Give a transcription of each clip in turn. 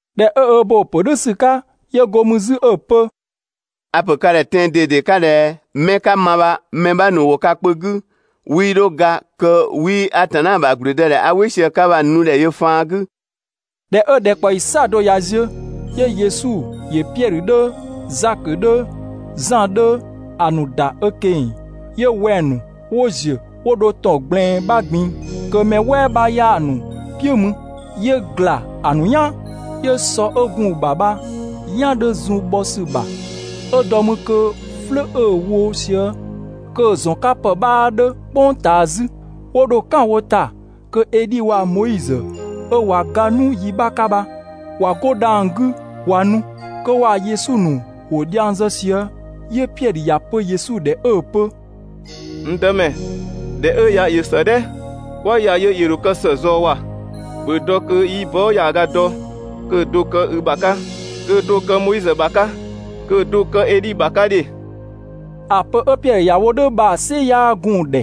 ꞊Dhɛ 'ö ö bo‑ ‑pö "dhʋ̈ ‑sü 'ka, 'yö go mü 'zü 'ö‑ pö: «A‑ ‑pö ka ‑dhɛ tɛan‑ ꞊dede 'ka ꞊dhɛ 'mɛ 'ka ma bha mɛ 'bha ‑nu ‑wo ka kpö 'gü 'wii 'dho ga kö 'wii Atanna ‑bha ‑gblüdëdhɛ 'a "wɩ sië‑ 'ka bha‑ nu ‑dhɛ yö faan 'gü. ꞊Dhɛ 'ö ‑dhɛkpaɔyi "saɔdo ꞊ya ziö, 'yö Yesu ‑yö Piɛdhö 'dhö, Zakö 'dhö, Zan 'dhö, ‑a ‑nu ‑da ö ꞊keng‑, 'yö wɛng‑ ‑nu 'wo ‑ziö 'wo dho ‑tɔn ꞊gblɛɛn 'bha ꞊gbin‑, kö mɛ "wɛɛ 'bha 'yaa‑ ‑nu "piʋ̈ mü. 'Yö ‑gla ‑a ‑nu "yaan. 'Yö sɔ 'ö gun‑ ‑bha bha‑ "yan 'dhö zun bhɔ ‑sü ‑bha, 'ö dɔ mü kö "flʋ̈ 'ö‑ wo sië kö‑ ‑zɔn 'ka ‑pë 'bhaa 'dhö "kpʋng ꞊taa 'zü. 'Wo dho "kan wo ‑ta kö Edhi waa‑ Moizö ('ö ꞊wa ga 'nu yi 'bha 'ka bha ꞊wa 'go dhang‑ 'gü ꞊wa nu), kö waa‑ Yesu ‑nu ‑wo dhiang zë sië. 'Yö Piɛdhö ‑ya pö Yesu ‑dhɛ 'ö‑ pö: «N Dëmɛ, ‑dhɛ 'ö ya ‑yö ‑së "dhɛ! 'Kwa ‑ya yö ‑yö ‑dho kë ‑së ꞊zɔɔ ‑wa! ‑Bhö dɔ kö 'yi bɔɔ" ‑yaaga dɔ kö‑ do‑ kë i ‑bha 'ka, kö‑ do‑ kë Moizö ‑bha 'ka, kö‑ do‑ kë Edhi ‑bha 'ka ‑dhe.» ‑A pö 'ö Piɛdhö ‑ya wo "dhʋ̈ bha‑ "sɩ 'yaa gun‑ ‑dhɛ.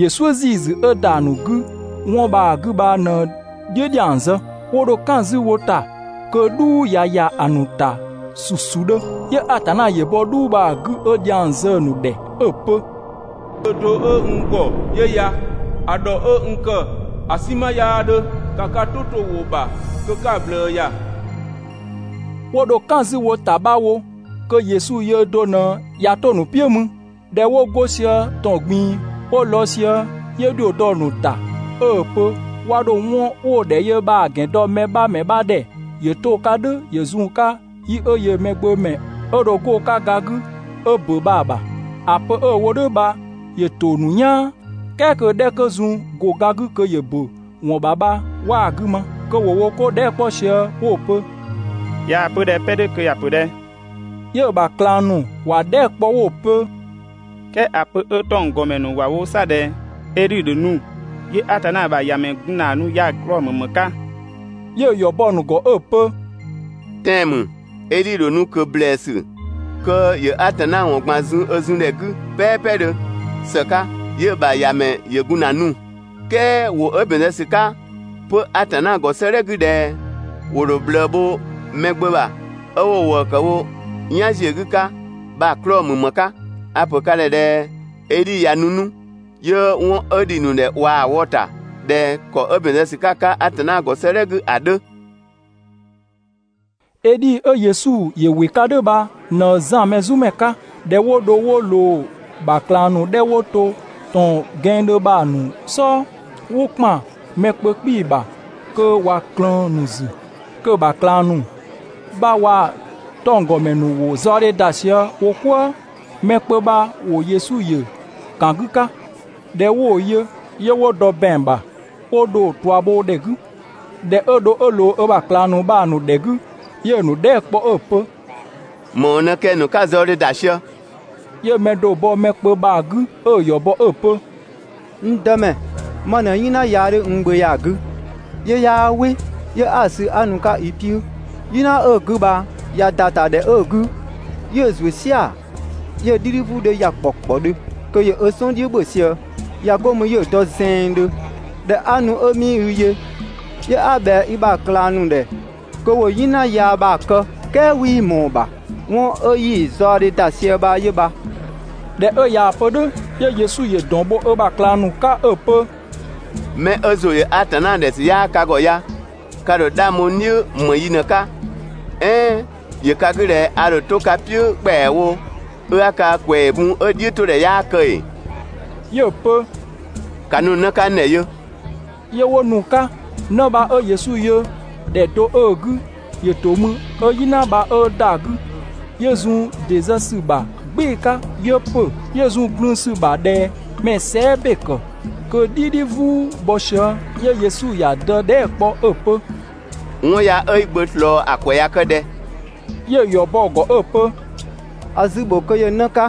‑Yö "suʋ̈ ‑ziisü 'ö ‑da ‑a ‑nu 'gü 'wɔn bha‑ 'gü bha ꞊në‑ "dhiʋ̈ ‑dhiang zë. 'Wo dho "kan 'zü wo ‑ta kö "dhuu ꞊ya ‑ya ‑a ‑nu ‑ta ‑susudhö. 'Yö Atanna ‑yö bɔ "dhuu bha‑ 'gü 'ö dhiang zë‑ ‑nu ‑dhɛ 'ö‑ pö: «N Gbö (do 'ö n ‑gɔ) 'yö ya, ‑a ‑dhɔ 'ö n ‑kë ‑a "sinma 'yaa 'dhö, ‑ka ka "tʋ 'to‑ ‑wʋ ‑bha kö 'ka‑ ꞊bhlëë ‑ya!» 'Wo dho "kan 'zü wo ‑ta 'bha wo kö Yesu yöö do ꞊në ꞊ya 'to‑ ‑nu "piʋ̈ mü. ꞊Dhɛ 'wo go sië ‑tɔn ꞊gbin‑ 'wo lɔɔ‑ sië, 'yö ‑dhio dɔ‑ ‑nu ‑ta 'ö‑ pö 'wa 'dho 'wɔn 'wo‑ ‑dhɛ yö bha‑ ‑gɛn dɔ mɛ 'bha ‑mɛ 'bha ‑dhɛ ‑yö 'to‑ 'ka "dhʋ̈ ‑yö zun‑ 'ka yi 'ö yöö Mɛgbömɛ 'ö dho 'go‑ 'ka ga 'gü 'ö ‑bö bha‑ ‑bha. ‑A pö 'ö‑ wo "dhʋ̈ bha, ‑yö ‑to ‑nu "yaan, "kɛɛ kö‑ 'dhɛ 'kö zun‑ ‑go ga 'gü kö ‑yö ‑bö ‑wɔn ‑bha bha 'waa‑ 'gü ma, kö ‑wo wo 'ko dhɛɛ" 'kpɔ sië 'wo‑ pö: «꞊Yaa‑ pö ꞊dhɛ 'pɛ 'dhö kö ꞊ya ‑pö ꞊dhɛ?» 'Yö‑ ‑bha ꞊klang ‑nu ‑wa dhɛɛ" kpɔ 'wo‑ pö: «"Kɛɛ ‑a pö 'ö 'tɔnggɔmɛ ‑nu ‑wa wo 'sa ꞊dhɛ Edhi ‑dho nu, 'yö Atanna ‑bha ‑Yamɛ gun ‑na nu ya‑ 'klɔɔ‑ ‑mü ‑më 'ka?» 'Yö‑ ‑yɔ bɔ‑ ‑nu ‑gɔ 'ö‑ pö: «Tɛan‑ ‑mü, Edhi dho nu ꞊kö ‑blɛɛsü kö ‑yö Atanna ‑wɔn ꞊gban zun ö zun ‑dhɛ 'gü "pɛɛpɛdhö ‑së 'ka, ('yö‑ ‑bha ‑Yamɛ ‑yö gun ‑na nu). "Kɛɛ ‑wʋ 'ö ‑bɛn zë ‑sü 'ka 'pö Atanna ‑gɔ 'sëëdhɛ 'gü ꞊dhɛ: ‹‑Wo ‑dho ꞊bhlëë bho Mɛgbömɛ ‑bha 'ö 'wo‑ ‑wëë ‑kë wo "yan ‑ziö 'gü 'ka› bha‑ 'klɔɔ‑ ‑mü ‑më 'ka? A‑ ‑pö ka ‑dhɛ ꞊dhɛ Edhi ꞊ya nu 'nu, 'yö 'wɔn 'ö ‑dhi ‑nu ‑dhɛ ꞊waa‑ wɔ‑ ‑ta ꞊dhɛ ‑kɔ 'ö ‑bɛn zë ‑sü 'ka‑ 'ka Atanna ‑gɔ 'sëëdhɛ 'gü ‑a 'dhö.» Edhi 'ö Yesu ‑yö ‑wɩ 'ka "dhʋ̈ bha ꞊në Zan Mɛzumɛ 'ka. ꞊Dhɛ 'wo dho 'wo ꞊loo‑ ‑bha ꞊klang ‑nu 'dhɛ 'wo to ‑tɔn ‑gɛnngdhö bha‑ ‑nu "sɔɔ, ‑wo ‑kpan mɛ kpö 'kpii‑ ‑bha kö ꞊wa ꞊klëën‑ ‑nu ‑zü, kö‑ ‑bha ꞊klang ‑nu bha waa‑ 'tɔnggɔmɛ ‑nu ‑wo zaɔdhe ‑da sië wo "kwëë. Mɛ kpö bha ‑wo Yesu ‑yö ‑kan 'gü 'ka. ꞊Dhɛ 'wo‑ yö, 'yö 'wo dɔ ‑bɛang ‑bha 'wo dho‑ ꞊tua bho ‑dhɛ 'gü. ꞊Dhɛ 'ö dho 'ö ꞊loo ö ‑bha ꞊klang ‑nu bha‑ ‑nu ‑dhɛ 'gü, 'yö‑ ‑nu dhɛɛ" kpɔ 'ö‑ pö: «‑Më ‑wɔn ꞊në kɛng‑ ‑nu 'ka‑ zaɔdhe ‑da sië?» 'Yö mɛ do‑ bɔ mɛ kpö bha‑ 'gü 'ö‑ ‑yɔ bɔ 'ö‑ pö: «N Dëmɛ, ma ꞊në "yina yaa 'dhö n gbö ya‑ 'gü, 'yö 'yaa "wɩ, 'yö 'a‑ sü 'a nu‑ 'ka i "piʋ̈. "Yina 'ö‑ 'gü bha ꞊ya ‑da ‑ta ‑dhɛ 'ö‑ 'gü, 'yö‑ ‑zuö "sia‑, 'yö‑ "dhidhi "vuu 'dhö ‑ya ‑kpɔkpɔdhö kö ‑yö ö "sɔn "dhiʋ̈ ‑bhö sië, ꞊ya 'go mü 'yö dɔ zɛɛndhö. ꞊Dhɛ 'a nu 'ö 'mii i yö, 'yö 'a ꞊bhɛa i ‑bha ꞊klang ‑nu ‑dhɛ kö ‑wo "yina yaa bha‑ kë, "kɛɛ 'wii ꞊mɔɔ‑ ‑bha. ('Wɔn 'ö 'yi‑ zɔadhe ‑da sië bha 'yö bha).» ꞊Dhɛ 'ö ꞊yaa‑ pö "dhʋ̈, 'yö Yesu ‑yö ‑dɔn bho ö ‑bha ꞊klang ‑nu 'ka 'ö‑ pö: «'Mɛ 'ö ‑zʋ ‑yö Atanna ‑dhɛ ‑sü 'yaa ka ‑gɔ ya, ka ‑dho 'dhang bho n "dhiʋ̈ ‑më yi ꞊në‑ 'ka, "ɛɛn ‑yö ka 'gü ꞊dhɛ a ‑dho 'to ka "piʋ̈ ‑kpɛawo, 'ö 'a ka ‑kwɛɛ bun 'ö‑ "dhiʋ̈todhɛ 'yaa kë ‑ee?» 'Yö‑ pö: «‑Ka nu‑ 'në 'ka n ‑dhɛ yö!» 'Yö 'wo nu‑ 'ka. 'Në bha 'ö Yesu yö ‑dhɛ do 'ö‑ 'gü ‑yö ‑to mü 'ö "yina bha 'ö ‑da 'gü, 'yö zun ‑dɩ ‑zë ‑sü ‑bha "gbɩɩ‑ 'ka, 'yö ‑pö, 'yö zun glün‑ ‑sü bha ꞊dhɛ mɛ‑ sɛɛ" ‑be ‑kë kö‑ "dhidhi "vuu‑ bhɔ sië. 'Yö Yesu ‑ya dë dhɛɛ" kpɔ 'ö‑ pö: «'Wɔn ya 'ö i gbö ꞊slɔɔ ‑a ‑kwɛ ꞊ya kë ꞊dhɛ?» 'Yö‑ ‑yɔ bɔ‑ ‑gɔ 'ö‑ pö: «‑A zü‑ ‑bho kö ‑yö 'në 'ka.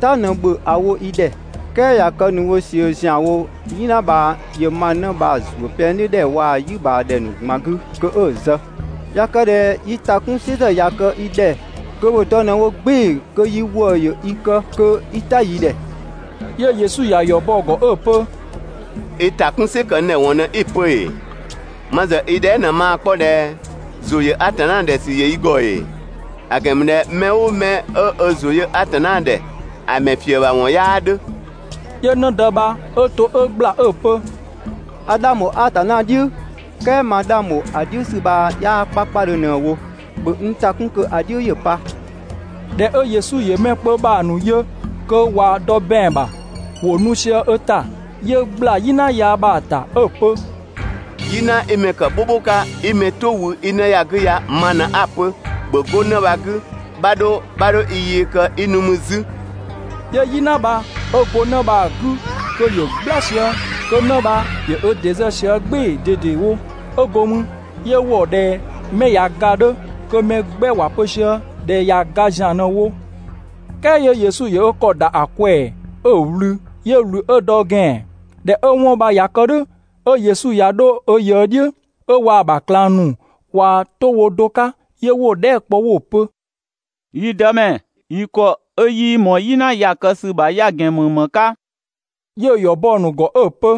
"Ta ꞊në ‑bhö ‑a wo yi ‑dhɛ, "kɛɛ ꞊ya kë ‑nu wo ꞊sië ‑zianwo "yina bha ‑yö ma 'në bha‑ ‑zuö pɛng "dhiʋ̈ ‑dhɛ ‑nu waa‑ "yi ꞊bhaa ‑dhɛ ‑nu ꞊gban 'gü kö 'ö‑ zë. ꞊Ya kë ꞊dhɛ yi ‑ta 'kun "sɩ ‑zë ꞊ya kë i ‑dhɛ kö ‑bhö dɔ ꞊në wo "gbɩɩ‑ kö yi ‑wëë ‑yö i kë kö 'i "ta yi ‑dhɛ!» 'Yö Yesu ꞊ya ‑yɔ bɔ‑ ‑gɔ 'ö‑ pö: «I ‑ta 'kun "sɩ ‑kë n ‑dhɛ ‑wɔn ꞊në 'i‑ pö ‑ee? Ma ‑zë i dhɛɛ" ꞊në maa‑ 'kpɔ ꞊dhɛ: ‑Zʋ ‑yö Atanna ‑dhɛ ‑sü ‑yö i ‑gɔ ‑ee? ‑A ‑gɛn ‑mü ꞊dhɛ mɛ "ʋʋ mɛ 'ö ö ‑zʋ yö Atanna ‑dhɛ ‑a ‑mɛ ‑fië ‑bha 'wɔn 'yaa 'dhö.» 'Yö 'në dë bha 'ö to 'ö ‑gbla 'ö‑ pö: «A 'dhang ‑bho Atanna "dhiʋ̈, "kɛɛ ma 'dhang ‑bho ‑a "dhiʋ̈ ‑sü bha 'yaa 'kpakpadhö ꞊në‑ wo. ‑Bhö n ‑ta 'kun kö ‑a "dhiʋ̈ ‑ya pa!» ꞊Dhɛ 'ö Yesu ‑yö mɛ kpö bha‑ ‑nu yö kö ꞊wa dɔ ‑bɛang ‑bha, ‑wo nu sië ö ‑ta, 'yö ꞊gbla "yina yaa bha‑ ‑ta 'ö‑ pö: «"Yina 'i mɛ ‑kë "bhʋbhʋ 'ka 'i mɛ "tʋ wü 'i 'në ya‑ 'gü ya ma ꞊në 'a‑ pö ‑bhö 'go 'në bha‑ 'gü, 'bha 'dho, 'bha 'dho i yee kë 'i nu mü 'zü!» 'Yö "yina bha 'ö go 'në bha‑ 'gü kö ‑yö "gbla sië, kö 'në ‑yö ö ‑dɩ ‑zë sië "gbɩɩ‑ ꞊dedewo. 'Ö go mü 'yö ‑wɔ ꞊dhɛ mɛ ꞊ya ga‑ 'dhö, kö mɛ 'gbɛ ‑wa pö sië ꞊dhɛ ꞊ya ga ‑zian ꞊në‑ wo. "Kɛɛ 'yö Yesu ‑yö ö ‑kɔ ‑da ‑a ꞊kwɛɛ‑ 'ö‑ ꞊wlü. 'Yö ꞊wlü 'ö dɔ ö ‑gɛan. ꞊Dhɛ 'ö 'wɔn bha ꞊ya kë "dhʋ̈, 'ö Yesu ꞊ya 'dho ö ꞊yëë "dhiʋ̈, 'ö waa‑ ‑bha ꞊klang ‑nu ꞊wa 'to wo do 'ka, 'yö 'wo‑ dhɛɛ" kpɔ 'wo‑ pö: «Yi Dëmɛ, yi ‑kɔ 'ö 'yii ꞊mɔɔ "yina ya‑ kë ‑sü ‑bha ya‑ ‑gɛn ꞊në ‑më 'ka?» 'Yö‑ ‑yɔ bɔ‑ ‑nu ‑gɔ 'ö‑ pö: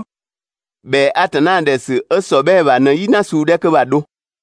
«‑Bhɛa Atanna ‑dhɛ ‑sü 'ö ‑sɔbhɛɛ ‑bha ꞊në "yina suu 'dhɛ 'kö bha‑ dho.»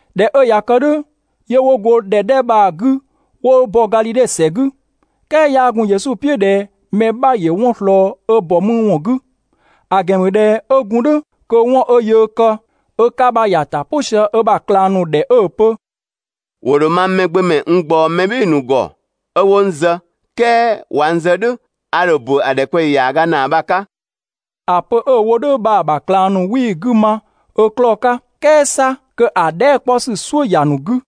꞊Dhɛ 'ö ꞊ya kë "dhʋ̈, 'yö 'wo go ‑dhɛ 'dhɛ bha‑ 'gü 'wo bɔ Gadhidhe ‑sɛ 'gü, "kɛɛ 'yaa gun Yesu "piʋ̈ ꞊dhɛ mɛ 'bha ‑yö 'wɔn ꞊slɔɔ ö ‑bɔ mü ‑wɔn 'gü. ‑A ‑gɛn ‑mü ꞊dhɛ 'ö gun "dhʋ̈ kö 'wɔn 'ö yöö kë ö 'ka bha ‑ya ‑ta "pʋ sië ö ‑bha ꞊klang ‑nu ‑dhɛ 'ö‑ pö: «‑Wo ‑dho mang Mɛgbömɛ n ꞊gbaɔ mɛ "bhɩɩ‑ ‑nu ‑gɔ 'ö 'wo n zë, "kɛɛ ꞊wa n zë "dhʋ̈, a ‑dho ‑bö ‑a ‑dhɛkpaɔyi ‑yaaga ‑naa bha‑ 'ka.» ‑A pö 'ö‑ wo "dhʋ̈ bha‑ ‑bha ꞊klang ‑nu 'wii‑ 'gü ma ö 'klɔɔ‑ 'ka, "kɛɛ 'sa kö‑ dhɛɛ" 'kpɔ ‑sü "suʋ̈ ‑ya ‑nu 'gü.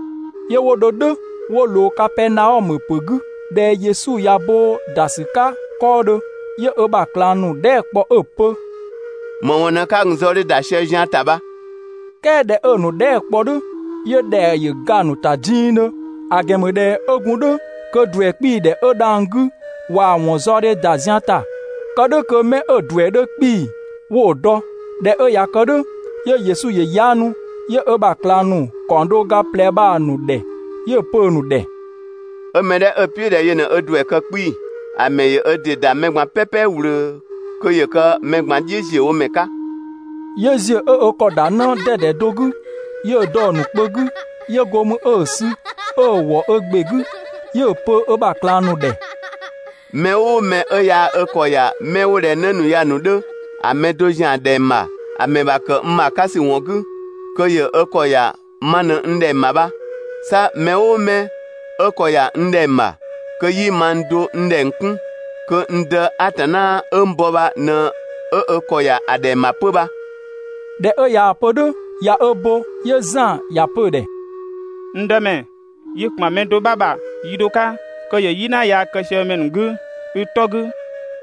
'Yö 'wo dho "dhʋ̈ 'wo ꞊loo Kapɛɛnaɔmö ‑pö 'gü. ꞊Dhɛ Yesu ꞊ya bo ‑da ‑sü 'ka 'kɔɔdhö, 'yö ö ‑bha ꞊klang ‑nu dhɛɛ" kpɔ 'ö‑ pö: «‑Më ‑wɔn ꞊në 'ka gun‑ zaɔkpadhe ‑da sië zian ‑ta bha?» "Kɛɛ ꞊dhɛ 'ö‑ ‑nu dhɛɛ" kpɔ "dhʋ̈, 'yö ‑dhɛa ‑yö ga‑ ‑nu ‑ta dingdhö, ‑a ‑gɛn ‑mü ꞊dhɛ 'ö gun "dhʋ̈ kö ‑duɛ 'kpii‑ ‑dhɛ 'ö dhang‑ 'gü ꞊waa‑ ‑wɔn zaɔdhe ‑da zian ‑ta kë "dhʋ̈ kö 'mɛ 'ö‑ ‑duɛ 'dhö 'kpii‑ 'wo‑ dɔ. ꞊Dhɛ 'ö ꞊ya kë "dhʋ̈, 'yö Yesu ‑yö 'yaanu, 'yö ö ‑bha ꞊klang ‑nu ‑kaɔng do ga ꞊plɛ bha‑ ‑nu ‑dhɛ, 'yö‑ pö‑ ‑nu ‑dhɛ: «'Ö 'mɛ 'dhɛ 'ö‑ "piʋ̈ ꞊dhɛ yö ꞊në ö ‑duɛ kë 'kpii‑, ‑a ‑mɛ ‑yö ö ‑dɩ ‑da mɛ ꞊gban "pɛpɛ ꞊wlöö kö ‑yö kë mɛ ꞊gban "dhiʋ̈ ‑ziö wo ‑mɛ 'ka.» 'Yö ‑ziö 'ö ö ‑kɔ ‑da 'në 'dɛdɛ do 'gü, 'yö‑ dɔ‑ ‑nu kpö 'gü, 'yö go mü 'ö‑ sü, 'ö‑ ‑wɔ ö ‑gbe 'gü, 'yö‑ pö ö ‑bha ꞊klang ‑nu ‑dhɛ: «Mɛ "ʋʋ mɛ 'ö yaa ö ‑kɔ ‑ya 'mɛ 'wo ꞊dhɛ 'në ‑nu ya‑ ‑nu 'dhö, ‑a mɛ do ‑zian ‑dhɛng ‑bha, ‑a ‑mɛ ‑bha kë n ‑bha 'ka ‑sü ‑wɔn 'gü, kö ‑yö ö ‑kɔ ‑ya ma ꞊në n ‑dhɛng ‑bha bha, 'sa mɛ "ʋʋ mɛ 'ö ‑kɔ ‑ya n ‑dhɛng ‑bha, kö 'yii mang do n ‑dhɛng 'kun, kö n Dë Atanna 'ö n ‑bɔ bha ꞊në 'ö ö ‑kɔ ‑ya ‑dhɛng ‑bha 'pö bha.» ꞊Dhɛ 'ö ꞊yaa‑ pö "dhʋ̈ ꞊ya ö bo, 'yö Zan ‑ya pö‑ ‑dhɛ: «N Dëmɛ, yi ‑kpan mɛ do 'bha ‑bha yi do 'ka kö ‑yö "yina yaa kë sië mɛ ‑nu 'gü i 'tɔ 'gü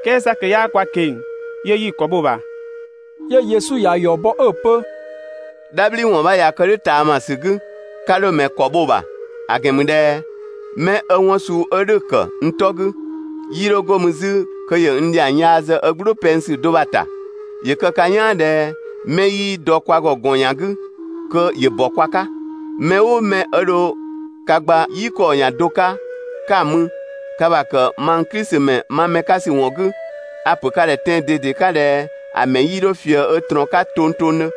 "kɛɛ 'sa kö 'yaa kwa ꞊keng‑, 'yö 'yi‑ ‑kɔ bho‑ ‑bha.» 'Yö Yesu ‑ya ‑yɔ bɔ 'ö‑ pö: «"Dhabhliwɔn 'bha ꞊ya kë "dhʋ̈ ꞊taamasü 'gü, 'ka 'dho‑ ‑mɛ ‑kɔ bho‑ ‑bha, ‑a ‑gɛn ‑mü ꞊dhɛ mɛ 'ö 'wɔn suu 'ö "dhʋ̈‑ ‑kë n 'tɔ 'gü, 'yii 'dho 'go mü 'zü kö ‑yö n ‑dhiang yaa zë ö "gblʋʋ pɛng ‑sü do bha‑ ‑ta. ‑Yö kë ka "yaan ꞊dhɛ 'mɛ 'yii dɔ kwa ‑gɔ ‑gɔn ‑yan 'gü kö ‑yö ‑bɔ kwa 'ka. Mɛ "ʋʋ mɛ 'ö dho ka gba "yi ‑kɔɔ ‑yan do 'ka 'ka‑ mü, ka ‑bha ‑kë mang Klisi ‑mɛ ma mɛ 'ka ‑sü ‑wɔn 'gü, a‑ ‑pö ka ‑dhɛ tɛan‑ ꞊dede 'ka ꞊dhɛ ‑a ‑mɛ 'yii 'dho ꞊fië ö ꞊trɔɔn 'ka tongtongdhö.»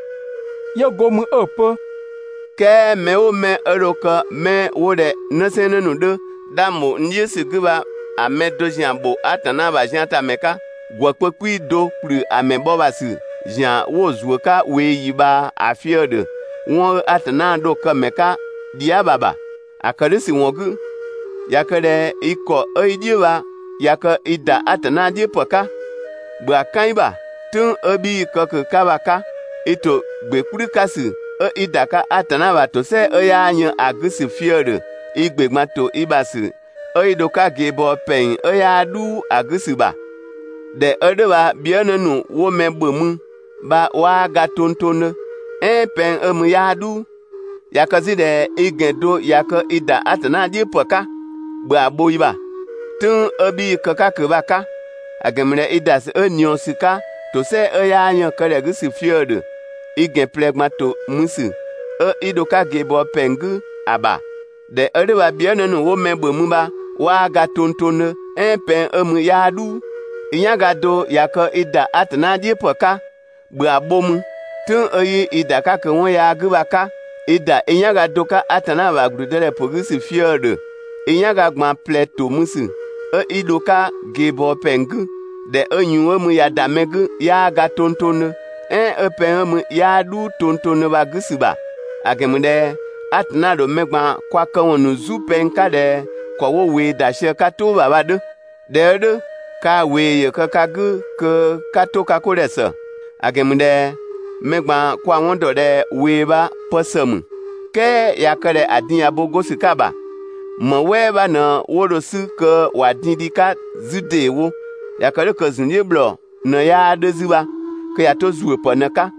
'Yö go mü 'ö‑ pö: «"Kɛɛ mɛ "ʋʋ mɛ 'ö dho kë 'mɛ 'wo ꞊dhɛ 'nësɛɛnnë ‑nu 'dhö 'dhang ‑bho n "dhiʋ̈ ‑sü 'gü bha‑ mɛ do ‑zian ‑bho Atanna ‑bha ziantamɛ 'ka, ‑gwë kpö 'kpii‑ do ‑kplü ‑a ‑mɛ bhɔ ‑bha ‑sü ‑zian 'wo‑ ‑mɛ ‑zuö 'ka ꞊weeyi ꞊bhaa ‑a fië‑ ‑dhö 'wɔn 'ö (Atanna) dho kë‑ ‑mɛ 'ka dhia" bha‑ ‑bha. ‑A ‑kë "dhʋ̈ ‑sü ‑wɔn 'gü, ꞊ya kë ꞊dhɛ i ‑kɔ 'ö i "dhiʋ̈ bha ꞊ya kë i ‑da Atanna "dhiʋ̈ ‑pë 'ka, ‑bhö ‑a "kan i ‑bha. ("Tʋ̈ng 'ö 'bhii‑ kë ꞊kö‑ 'ka bha‑ 'ka). I ‑to ‑gbe "kplü 'ka ‑sü 'ö 'i ‑da 'ka Atanna ‑bha ‑tosɛa 'ö 'yaa yën ‑a 'gü ‑sü fië‑ ‑dhö i ‑gbe ꞊gban ‑to i ‑bha ‑sü 'ö 'i dho‑ 'ka ꞊geebɔɔ ‑pɛng 'ö 'yaa "dhuu ‑a 'gü ‑sü ‑bha. [‑Dhɛ 'ö "dhʋ̈ bha bhiënë ‑nu 'wo mɛ ‑bhö mü bha 'waa ga tongtongdhö "ɛɛn pɛng 'ö mü 'yaa "dhuu]. ꞊Ya kë 'zü ꞊dhɛ i ‑gɛn do ꞊ya kë i ‑da Atanna "dhiʋ̈ ‑pë 'ka, ‑bhö ‑a bho i ‑bha. ("Tʋ̈ng 'ö 'bhii‑ kë‑ 'ka ꞊kö bha‑ 'ka). ‑A ‑gɛn ‑mü ꞊dhɛ i ‑da ‑sü 'ö ꞊niɔɔsü 'ka ‑tosɛa 'ö 'yaa yën‑ kë ‑dhɛ 'gü ‑sü fië‑ ‑dhö i ‑gɛn ꞊plɛ ꞊gban ‑to mü ‑sü 'ö 'i dho‑ 'ka ꞊geebɔɔ ‑pɛng 'gü ‑a ‑bha. [‑Dhɛ 'ö "dhʋ̈ bha bhiënë ‑nu 'wo mɛ ‑bhö mü bha 'waa ga tongtongdhö "ɛɛn pɛng 'ö mü 'yaa "dhuu.] I "yanga do ꞊ya kë i ‑da Atanna "dhiʋ̈ ‑pë 'ka, ‑bhö ‑a bho mü, ("tʋ̈ng 'ö 'yii i ‑da ꞊kö 'wɔn yaa 'gü bha‑ 'ka) i ‑da i "yanga do 'ka Atanna ‑bha ‑gblüdëdhɛpö 'gü ‑sü fië‑ ‑dhö i "yanga ꞊gban ꞊plɛ ‑to mü ‑sü 'ö 'i dho‑ 'ka ꞊geebɔɔ ‑pɛng 'gü, ‑dhɛ 'ö ꞊yuun 'ö mü ꞊ya ‑da mɛ 'gü 'yaa ga tongtongdhö, "ɛɛn 'ö pɛng 'ö mü 'yaa "dhuu tongtongdhö bha‑ 'gü ‑sü ‑bha. ‑A ‑gɛn ‑mü ꞊dhɛ Atanna ‑dho mɛ ꞊gban kwa këwɔn ‑nu "zu pɛng 'ka ꞊dhɛ ‑kɔ 'wo ꞊wee ‑da sië‑ 'ka "tʋʋ ‑bha bha‑ 'dhö. ꞊Dhɛ 'ö "dhʋ̈, kaa ꞊wee ‑yö kë ka 'gü kö 'ka 'to ka 'ko ‑dhɛ ‑së, ‑a ‑gɛn ‑mü ꞊dhɛ mɛ ꞊gban kwa‑ 'wɔn ‑dɔ ꞊dhɛ ꞊wee bha pë ‑së ‑mü, "kɛɛ ꞊ya kë ꞊dhɛ ‑a din ꞊ya bo 'go ‑sü 'ka ‑bha, ‑më "wɛɛ 'bha ꞊në 'wo dho‑ 'sü kö ‑wa din dhi‑ 'ka 'zü ‑deewo? ꞊Ya kë "dhʋ̈ kö ‑zun "dhiʋ̈ ‑bhlɔɔ ꞊në 'yaa 'dhö 'zü bha (kö ꞊ya 'to ‑zuöpë ꞊në‑ 'ka.).»